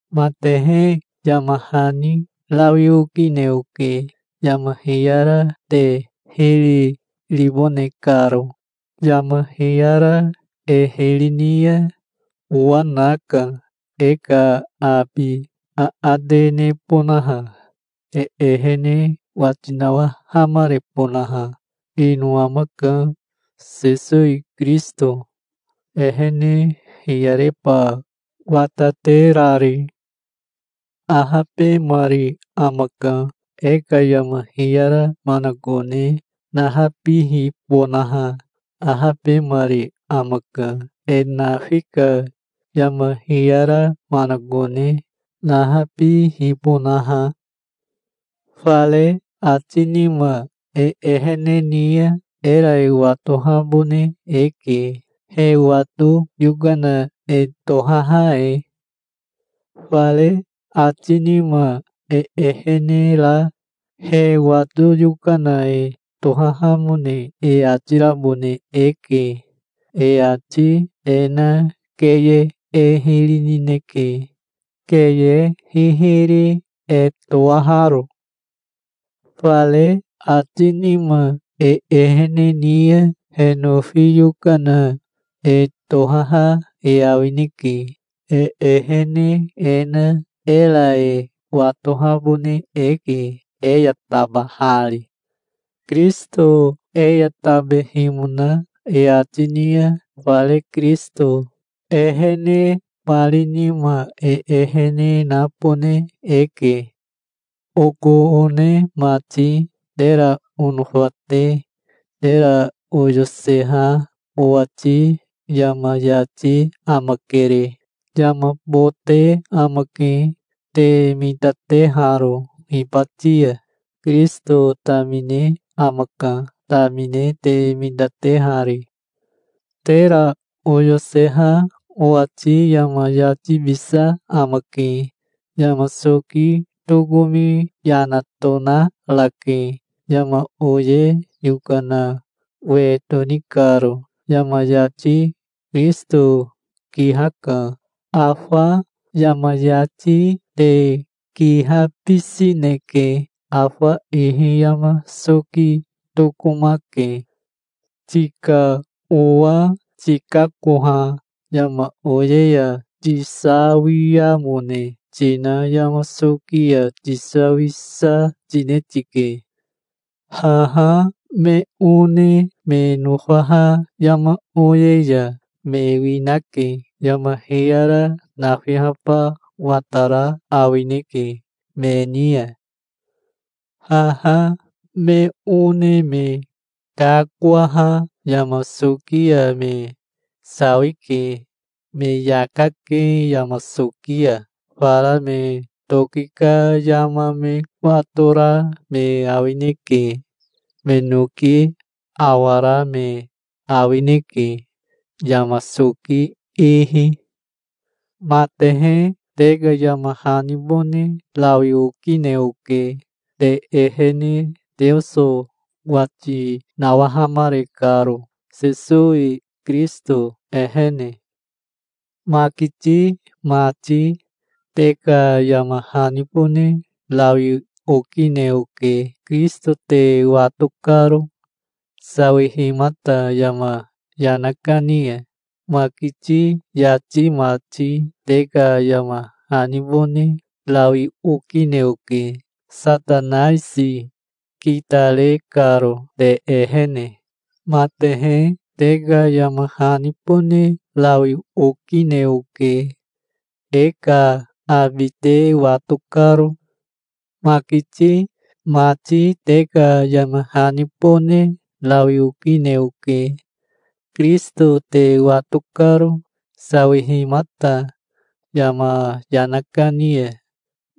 Matehe, yama hani rawi okine oke, yama hiyara te hiri ribone karo. Yama hiyara e hiri ni ya owa naka, e ka abi aate nebonaha, e ehene wati nawahamarebonaha. Ino amaka, Sesowi Kirisito, ehene hiyareba wataterari. Ahabemari amaka, e ka yama hiyara manakone nahabihibonaha. Ahabemari amaka, e nafi ka yama hiyara manakone nahabihibonaha. Fare ati nima e ehene ni ya, era e watohabone eke, he wato yokana e tohaha e. Fare ati nima e ehene ra he wato yokana e tohahamone e ati rabone eke. E ati e na keye e hiri nineke, keye hihiri e toaharo. Fare ati nima e ehene ni ya he nofi yokana e tohaha e awineke. E ehene e na era e watohabone eke, e ya tabahari. Kirisito e ya tabehimona e ati ni ya fare Kirisito ehenemari nima e ehene nabone eke. Oko one mati, tera onofa te, tera oyoseha owati yama yati amakere. Yama bote amake, te mitateharo hibati ya. Kirisito tamine amaka, tamine te mitatehari. Tera oyoseha owati yama yatibisa amake. Yama soki tokomi yana tonarake, yama oye yokana we toni karo. Yama yati Kirisito kihaka. Afa yama yati te kihabisineke. Afa ihi yama soki tokomake. Tika owa tikakoha yama oye ya tisawiamone tina yama soki ya tisawisa tine tike. Haha me one me nofaha yama oye ya me winake. Yama hiyara nafihaba watara awineke me ni ya. Haha me one me kakoaha yama soki ya me sawike. Me yaka ke yama soki ya. Fara me toki ka yama me watora me awineke. Me noki awara me awineke, yama soki ihi. Matehe te ka yama hanibone rawi okine oke, te ehene Teoso wati nawahamare karo, Sesowi Kirisito ehene. Makiti mati, te ka yama hanibone rawi okine oke, Kirisito te wato karo, sawihimata yama yana kani ya. Makiti yati mati te ka yama hanibone rawi okine oke, Satanaisi kitare karo te ehene. Matehe, te ka yama hanibone rawi okine oke, e ka abi te wato karo. Makiti mati te ka yama hanibone rawi okine oke, Kirisito te wato karo, sawihimata yama yana kani ya.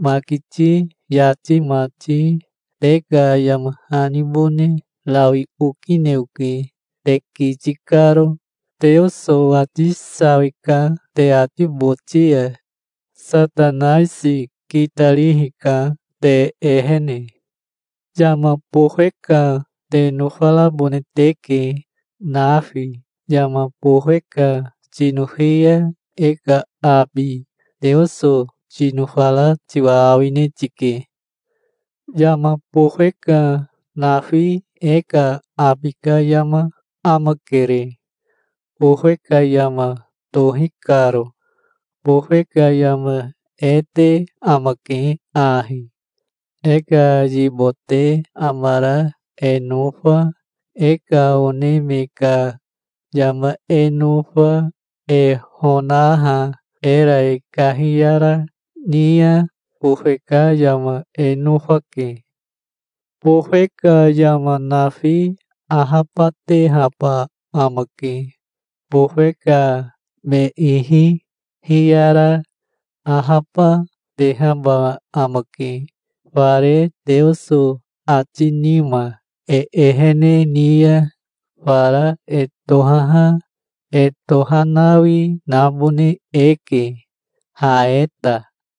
Makiti yati mati, te ka yama hanibone rawi okine oke, te kiti karo. Teoso ati sawi, ka te ati boti ya. Satanaisi kitarihi ka te ehene. Yama bofe ka te nofarabone teke, nafi. Yama bofe ka tinofi ya e ka abi Teoso tinofara tiwa awine tike. Yama bofe ka nafi e ka abi ka yama amakere, bofe ka yama tohi karo. Bofe ka yama e te amake ahi: e ka yibote amara e nofa, e ka one me ka yama e nofa, e honaha era e kahiyara, ni ya bofe ka yama e nofake. Bofe ka yama nafi ahabatehaba amake. Bofe ka me ihi hiyara ahaba, tehaba amake. Fare Teoso ati nima e ehene ni ya fara e tohaha e tohanawi nabone eke, ha e ta.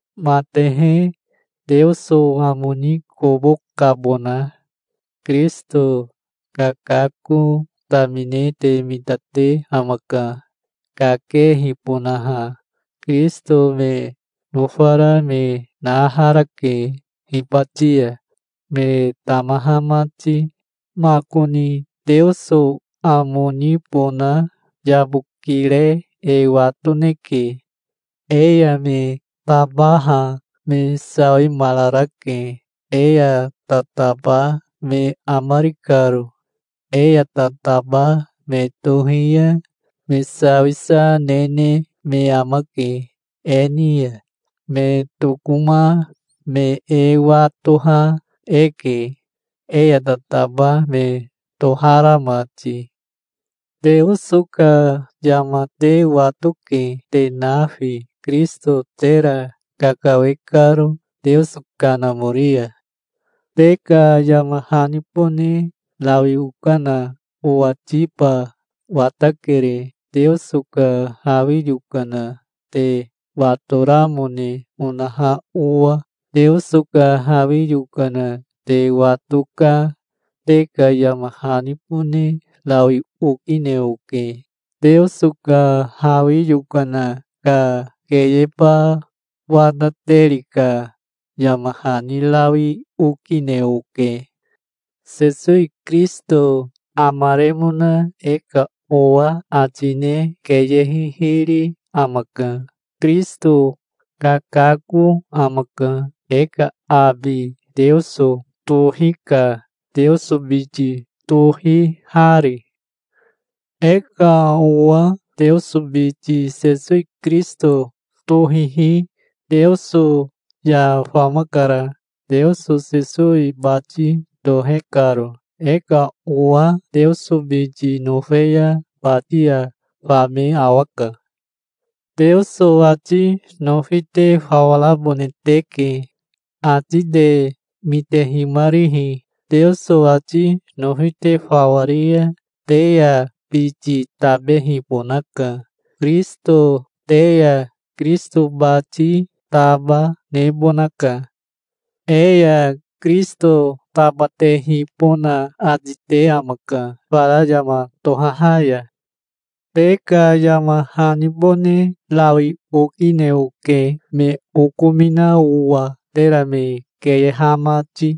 Matehe, Teoso amo ni kobo kabona. Kirisito kakako tamine te mitate amaka, kakehibonaha. Kirisito me nofara me naharake hibati ya, me tamaha mati. Makoni Teoso amo nibona yabokire e watoneke. E ya me tabaha me sawimararake, e ya tataba me amari karo. E ya tataba me tohi ya me sawisa nene me amake e ni ya. Me tokoma me e watoha eke, e ya tataba me tohara mati. Teoso ka yama te watoke, te nafi, Kirisito tera kakawe karo Teoso Kanamori ya. Te ka yama hanibone rawi okana owatiba watakere, Teoso ka hawi yokana te watoramone onaha owa. Teoso ka hawi yokana te wato ka te ka yama hanibone rawi okine oke. Teoso ka hawi yokana ka keyeba watateri ka yama hani rawi okine oke. Sesowi Kirisito amaremona e ka owa ati ne keye hihiri amaka. Kirisito kakako amaka. E ka abi Teoso tohika, Teoso biti tohihari. E ka owa Teoso biti Sesowi Kirisito tohihi Teoso ya famakara, Teoso Sesowi bati tohe karo. E ka owa Teoso biti nofe ya bati ya fame awaka. Teoso ati nofi te fawa rabone teke, ati te mitehimarihi. Teoso ati nofi te fawa ri ya te ya biti tabehibonaka, Kirisito. Te ya Kirisito bati taba, nebonaka. E ya Kirisito tabatehibona ati te amaka, fara yama tohaha ya. Te ka yama hanibone rawi okine oke me okomina owa, tera me keyeha mati.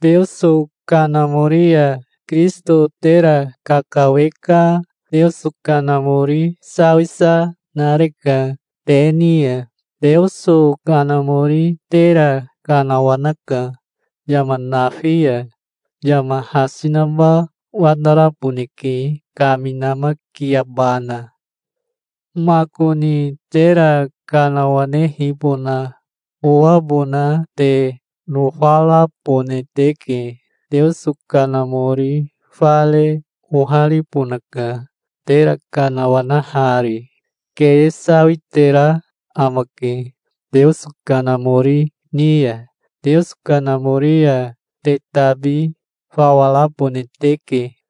Teoso Kanamori ya Kirisito tera kakawe ka Teoso Kanamori sawisa nareka te ni ya. Teoso Kanamori tera kanawanaka, yama nafi ya. Yama hasi naba wataraboneke kaminamakiabana. Makoni tera kanawanehibona owabona te nofarabone teke. Teoso Kanamori fare oharibonaka tera kanawanahari. Keye sawitera amake Teoso Kanamori ni ya. Teoso Kanamori ya te tabi fawa rabone teke.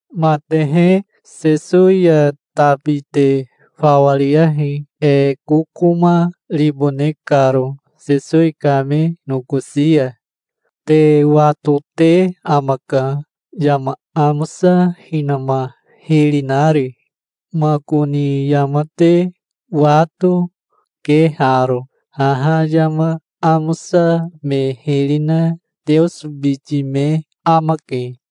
Matehe, Sesowi ya tabi te fawa riyahi, e kokoma ribone karo Sesowi kame nokosi ya. Te watote amaka, yama amosa hinama hiri nari. Makoni yama te wato, ke haro: haha yama amosa me hiri na Teoso biti me amake.